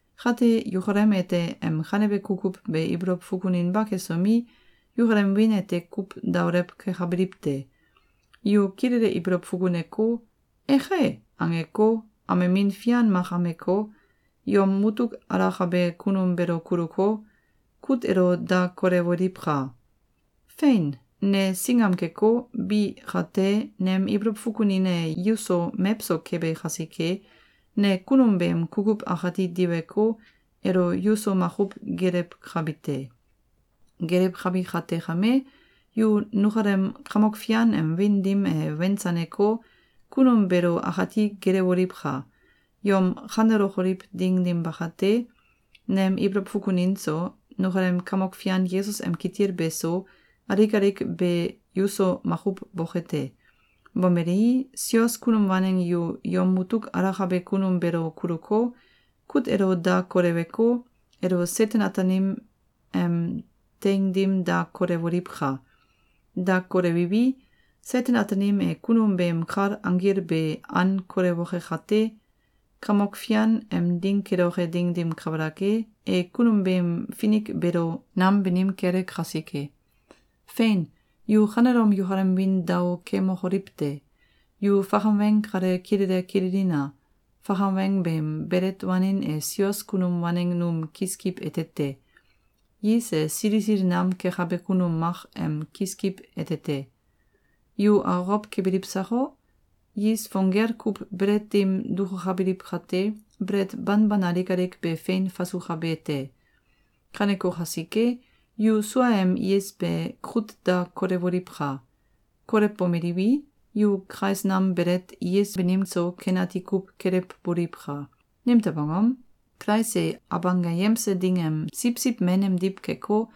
Kate, yukalem ete em kanebe kukuw be ibolow fukuninba kesomi, yukalem wiin ete kuw daolew kekabiliw te! Yu kilele ibolow fukuneko, “Eke!”, angeko, amemin fian mak ameko, yom mutuk alakabe kunum beelo kuluko, kut elo da kolewoliwka! Fein! Ne singam keko, bi kate, nem ibolow fukunin e yuso mewso kebe kasike, ne kunum beem kukuw akati diweko, elo yuso makuw geelewkabi te. Geelewkabi kate kame, yu nukalem Kamok Fian Yesus em wiin dim e wensaneko, kunum beelo akati geelewoliwka! Yom kanelokoliw ding dim bakate, nem ibolow fukunin so, nukalem Kamok Fian Yesus em kitil beso, alik alik be yuso makuw boke te. Bomelei, sios kunum waneng yu yom mutuk alakabe kunum beelo kuluko, kut elo da koleweko, elo Seten-Ataanim em teing dim da kolewoliwka! Da kolewiwi, Seten-Ataanim e kunum beem kal anggil be an kolewoke kate, Kamok Fian em Ding keloke ding dim kabalak e, e kunum beem finik beelo nam banim kele kasike. Feinka! Yu kanelom yukalem wiin dao kemokoliw te! Yu fakam weng kale kilele kililina! Fakam weng beem belet wanin e sios kunum waneng num kiskiw ete te. Is e sili sili nam kekabe kunum mak em kiskiw ete te. Yu akokow kebiliw sako? Is fong gel kuw belet dim dukukabiliw kate, belet banban alik alik be fein fasukabe te. Kaneko kasike, yu suaem is be kut da kolewoliwka! Kolewbomeliwi, yu kais nam belet is banim so, ken ati kuw kelewboliwka! Nimtew angom? Kulais e Abanggayemse Ding em siwsiw men emdiw keko,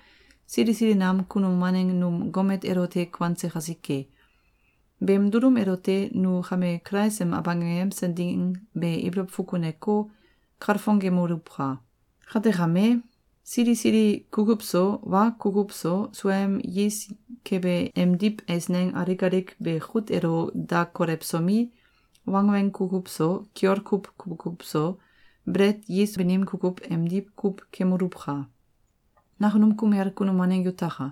sili sili nam kunum waneng num gomet elote kuanse kasike. Beem dulum elote nu kame Kulais em Abanggayemse Ding be ibolow fukuneko, kalfongemoluwka! Kate, kame, sili sili kukuw so, wa kukuw so, suaem is kebe emdiw eisneng alik alik be kut elo da kolewsomi, wangweng kukuw so, kiol kuw kukuw so, belet is banim kukuw emdiw kuw kemoluwka! Nakunum kumel kunum waneng yutaka!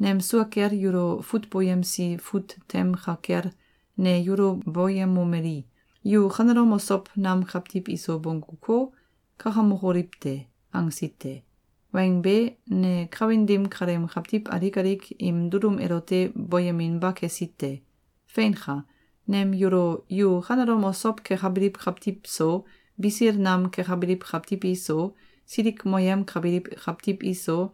Nem sua kel yulo fut boyemsi fut tem ka kel, ne yulo boyemomeli: “Yu kanelom osow nam kawtiw iso bongguko, kakamokoliw te!”, angsi te. Weng be, ne kawin dim kaleem kawtiw alik alik im dulum elote boyeminba kesi te. Feinka! Nem yulo “Yu kanelom osow kekabiliw kawtiw so, bisil nam kekabiliw kawtiw iso, silikmoyemkabiliw kawtiw iso,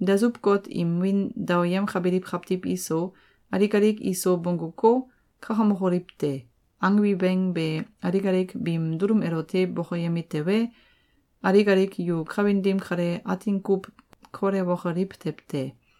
dasuw-got im wiin daoyemkabiliw kawtiw iso, alik alik iso bongguko, kakamokoliw te!”, angbi weng be alik alik biim dulum elote bokoyemi tewe, alik alik yu kawin dim kale atin kuw kolewokoliw tew te.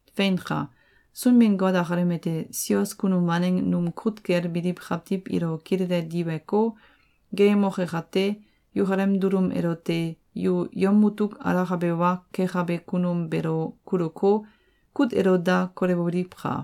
Feinka! Sunbin-Got akalem ete sios kunum waneng num kut kel biliw kawtiw ilo kilele diweko, geeyemoke kate, yukalem dulum elote “yu yom mutuk alakabe wa kekabe kunum beelo kuluko, kut elo da kolewoliwka!”